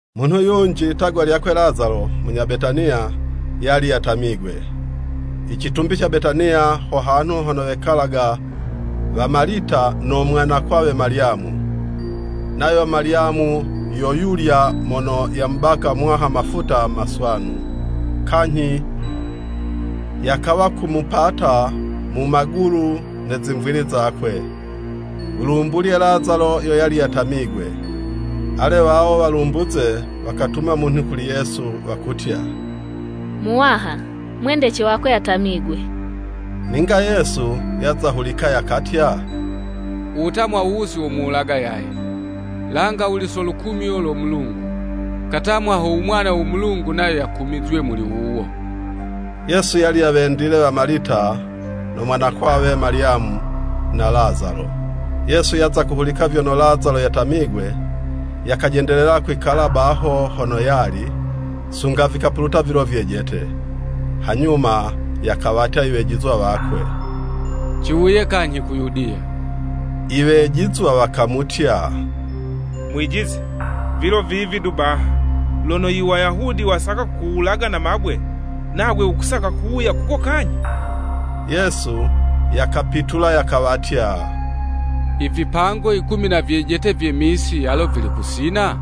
Munhu yunji, litagwa lyakwe Lazalo munya Betaniya, yali yatamigwe. (Icitumbi ca Betaniya, ho hanhu hono wekalaga wa Malita no mwanakwawe Malyamu. Nayo Malyamu yo yulya mono yamubaka Muwaha mafuta maswanu, kanyhi yakawa kumupata mu magulu ne zimvili zakwe. U lumbulye Lazalo yo yali yatamigwe.) Ale wawo walumbuze wakatuma munhu kuli Yesu, wakutya, “Muwaha, mwendece wako yatamigwe!” Ninga Yesu yaza hulika, yakatya, “Uwutamwa wuwu si womuwulaga yaye, langa wuli so lukumyo lo Mulungu, katamwa ho u Mwana wo Mulungu nayo yakumizywe muli wuwo.” Yesu yali yawendile wa Malita, no mwanakwawe Malyamu, na Lazalo. Yesu yaza kuhulika vyono Lazalo yatamigwe, yakajendelela kwikala baho hono yali, sunga vikapuluta vilo vyejete. Hanyuma yakawatya iwejizwa wakwe, “Ciwuye kanyhi ku Yudiya.” Iwejizwa wakamutya, “Mwijizi, vilo vivi du baha, lono Iwayahudi wasaka kukuwulaga na mabwe, nagwe wukusaka kuwuya kuko kanyhi?” Yesu yakapitula yakawatya, “I vipango yikumi na vyejete vye misi, alo vili kusina?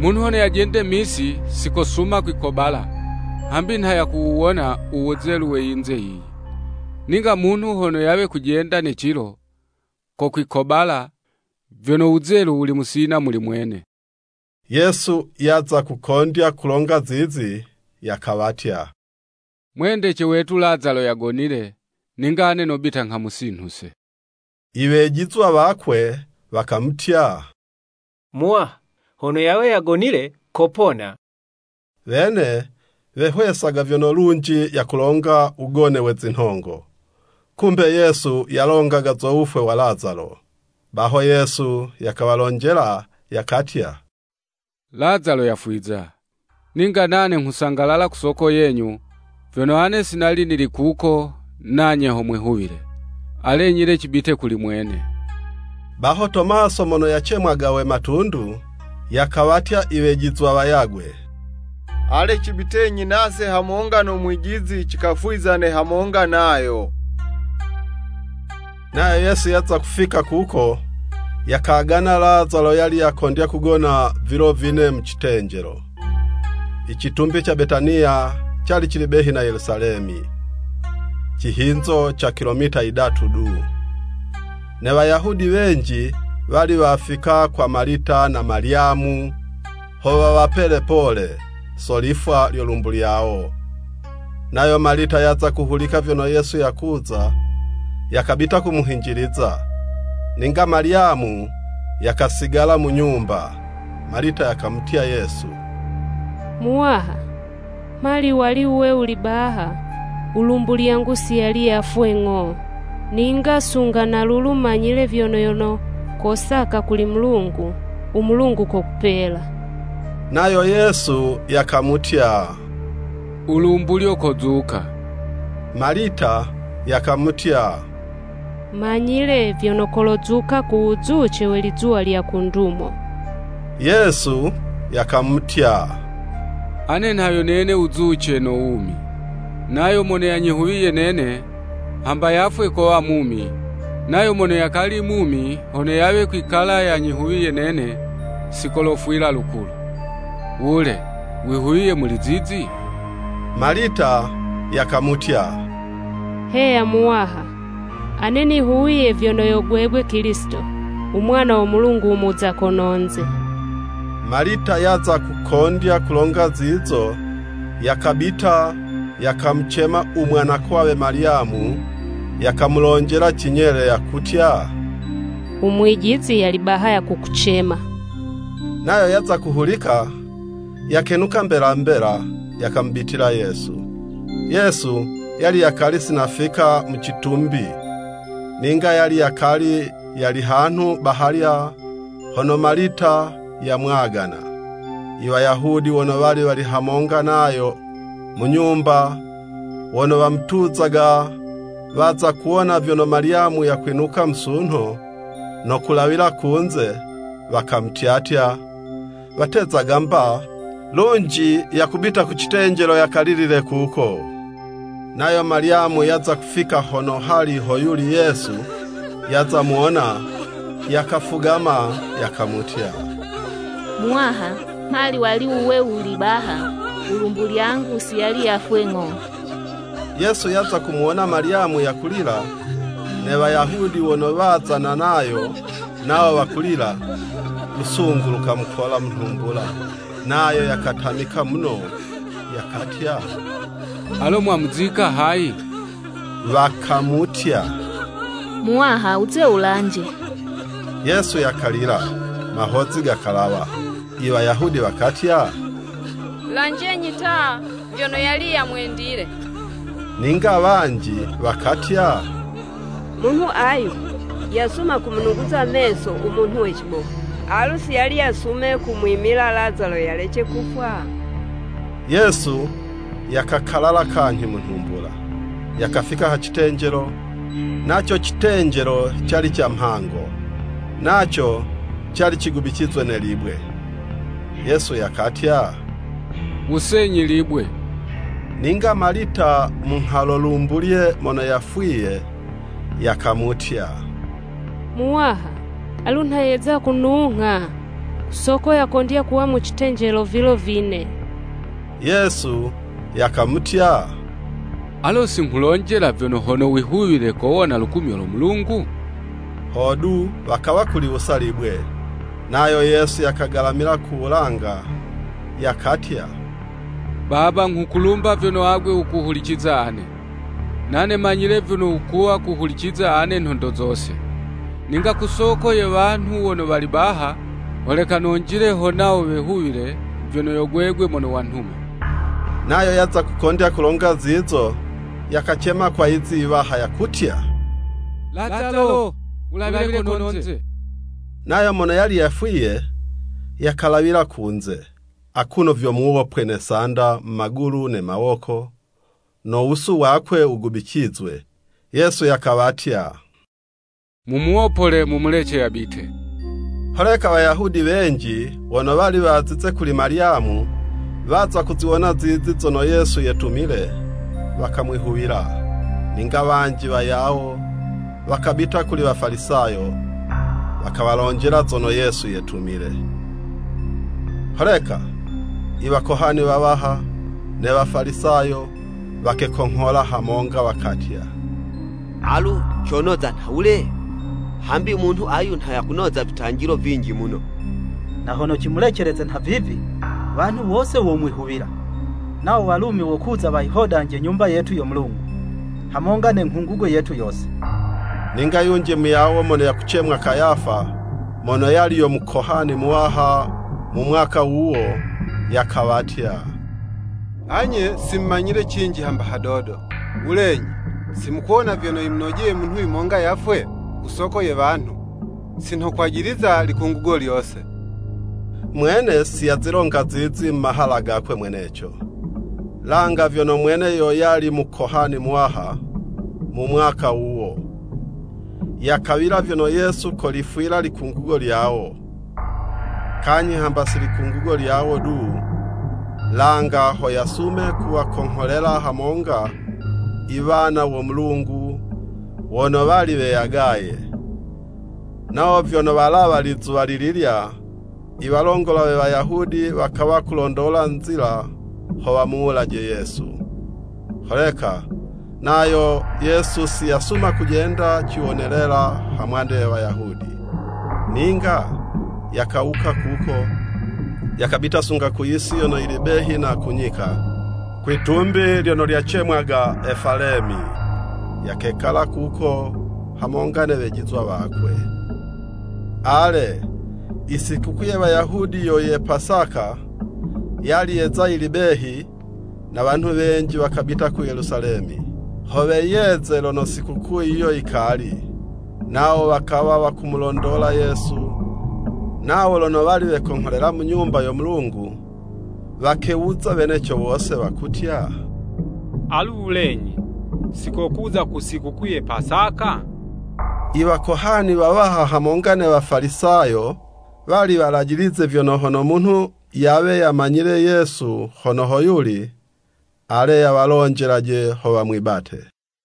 Munhu hono yajende misi, si kosuma kwikobala, hambi nha yakuwuwona u wuzelu we yinze yiyi. Ninga munhu hono yawe kujenda ne cilo, kokwikobala, vyono wuzelu wuli musina muli mwene.” Yesu yaza kukondya kulonga zizi, yakawatya, “Mwendece wetu Lazalo yagonile, ninga ane nobita nghamusinhuse.” Iwejizwa wakwe wakamutya, “Muwaha, hono yawe yagonile kopona.” Wene wehwesaga vyono lunji yakulonga wugone we zinhongo, kumbe Yesu yalongaga zo wufwe wa Lazalo. Baho Yesu yakawalonjela, yakatya, “Lazalo yafwiza. Ninga nane nghusangalala ku soko yenyu, vyono ane si nali nili kuko, nanye ho mwihuwile. Alenyi le cibite kuli mwene.” Baho Tomaso mono yacemwaga we Matundu, yakawatya iwejizwa wayagwe, “Ale cibitenyi nase hamonga no Mwijizi, cikafwizane hamonga nayo.” Nayo Yesu yaza kufika kuko, yakagana Lazalo yali yakondya kugona vilo vine mu citenjelo. Icitumbi ca Betaniya cali cili behi na Yelusalemi, cihinzo ca kilometa yidatu du. Ne Wayahudi wenji wali wafika kwa wa Malita na Malyamu, ho wawapele pole, so lifwa lyo lumbu lyawo. Nayo Malita yaza kuhulika vyono Yesu yakuza, yakabita kumuhinjiliza, ninga Malyamu yakasigala mu nyumba. Malita yakamutya Yesu, “Muwaha, mhali wali wuwe wuli baha, u lumbu lyangu si yali yafwe ng'o. Ninga sunga na lulu manyile vyono yono kosaka kuli Mulungu, u Mulungu kokupela.” Nayo Yesu yakamutya, “Ulumbulyo kozuka.” Malita yakamutya, “Manyile vyono kolozuka ku wuzuce we lizuwa lya ku ndumo.” Yesu yakamutya, “Ane nha yo nene wuzuce, no wumi. Nayo mono yanyihuwiye nene, hamba yafwe kowa mumi, nayo mono yakali mumi, hono yawe kwikala yanyihuwiye nene, si kolofwila lukulu. Wule, wihuwiye muli zizi?” Malita yakamutya, “Heya Muwaha! Ane nihuwiye vyono yo gwegwe Kilisito, u Mwana wo Mulungu u muza kononze.” Malita yaza kukondya kulonga zizo, yakabita, yakamucema u mwanakwawe Malyamu, yakamulonjela cinyele, yakutya, “U mwijizi yali baha yakukucema.” Nayo yaza kuhulika, yakenuka mbela mbela, yakamubitila Yesu. ( Yesu yali yakali si nafika mu citumbi, ninga yali yakali yali hanhu bahalya hono Malita yamwagana.) Iwayahudi wono wali wali hamonga nayo mu nyumba, wono wamutuzaga, waza kuwona vyono Malyamu yakwinuka musunho, no kulawila kunze, wakamutyatya, watezaga 'mba lunji, yakubita ku citenjelo yakalilile kuko. Nayo Malyamu yaza kufika hono hali ho yuli Yesu, yaza muwona, yakafugama, yakamutya, “Muwaha mhali wali wuwe wuli baha, ulumbu lyangu si yali yafwe ng'o.” Yesu yaza kumuwona Malyamu yakulila, ne Wayahudi wono wazana nayo, nawo wakulila, lusungu lukamukola mu nhumbula, nayo yakatamika muno, yakatya, “Alo mwamuzika hayi.” Wakamutya, “Muwaha wuze wulanje.” Yesu yakalila mahozi gakalawa. Iwayahudi wakatya, “Lanjenyi ta vyono yali yamwendile.” Ninga wanji wakatya, “Munhu ayu yasuma kumunuguza meso u munhu we cibofu, alu si yali yasume kumwimila Lazalo yalece kufwa.” Yesu yakakalala kanyhi mu nhumbula, yakafika ha citenjelo, naco citenjelo cali ca mhango, naco cali cigubicizwe ne libwe. Yesu yakatya, “Wusenyi libwe.” Ninga Malita munghalo lumbulye mono yafwiye, yakamutya, “Muwaha, alu nha yeza kunungha, ku soko yakondya kuwa mu citenjelo vilo vine.” Yesu yakamutya, “Alo si nghulonjela vyono hono wihuwile, kowona lukumyo lo Mulungu?” Hodu, wakawa kuliwusa libwe. Nayo Yesu yakagalamila ku wulanga, yakatya, “Baba nghukulumba vyono agwe wukuhuliciza ane. Nane manyile vyono wukuwa kuhuliciza ane nhondo zose. Ninga ku soko ye wanhu wono wali baha, holeka nonjile, ho nawo wehuwile, vyono yo gwegwe mono wanhuma.” Nayo yaza kukondya kulonga zizo, yakacema kwa yizi iwaha, yakutya, “Lazalo, wulawile kononze!” Nayo mono yali yafwiye, yakalawila kunze, akuno vyo muwopwe ne sanda mu magulu ne mawoko, no wusu wakwe wugubicizwe. Yesu yakawatya, “Mumuwopole, mumulece yabite.” Holeka Wayahudi wenji wono wali wazize kuli Malyamu, waza kuziwona zizo zono Yesu yetumile, wakamwihuwila. Ninga wanji wayawo wakabita kuli Wafalisayo, wakawalonjela zono Yesu yetumile. Holeka i Wakohani wawaha, ne Wafalisayo wakekonghola hamonga, wakatya, “Alu conoza nhawule? Hambi munhu ayu nha yakunoza vitanjilo vinji muno. Na hono cimuleceleze nhavivi, wanhu wose womwihuwila, nawo Walumi wokuza wayihodanje Nyumba yetu yo Mulungu, hamonga ne nghungugo yetu yose!” Ninga yunji muyawo mono yakucemwa Kayafa, mono yali yo Mukohani muwaha mu mwaka wuwo, yakawatya, “Anye si mumanyile cinji hamba hadodo!” Wulenyi, si mukuwona vyono yimunojeye munhu yumonga yafwe, ku soko ye wanhu, si nho kwajiliza likungugo lyose. Mwene si yazilonga zizi mu mahala gakwe mweneco, langa vyono mwene yo yali Mukohani muwaha mu mwaka wuwo, yakawila vyono Yesu kolifwila likungugo lyawo. Kanyhi hamba si likungugo lyawo du, langa ho yasume kuwakongholela hamonga iwana wo Mulungu wono wali weyagaye. Nawo vyono walawa lizuwa lililya, i walongola we Wayahudi wakawa kulondola nzila ho wamuwulaje Yesu. Holeka nayo Yesu si yasuma kujenda ciwonelela hamwande ye Wayahudi. Ninga yakawuka kuko, yakabita sunga ku yisi yono yili behi na ku nyika, kwitumbi lyono lyacemwaga Efalemi. Yakekala kuko hamonga ne wejizwa wakwe. Ale, Isikukuu ye Wayahudi yo ye Pasaka, yali yeza yili behi, na wanhu wenji wakabita ku Yelusalemi, ho weyeze lono sikukuu yiyo yikali. Nawo wakawa wakumulondola Yesu, nawo lono wali wekongholela mu Nyumba yo Mulungu, wakewuza, weneco wose, wakutya, “Alu wulenyi, sikokuza ku sikukuu ye Pasaka?” Iwakohani wawaha hamonga ne Wafalisayo, wali walajilize vyono, hono munhu yawe yamanyile Yesu hono hoyuli, ale yawalonjelaje, ho wamwibate.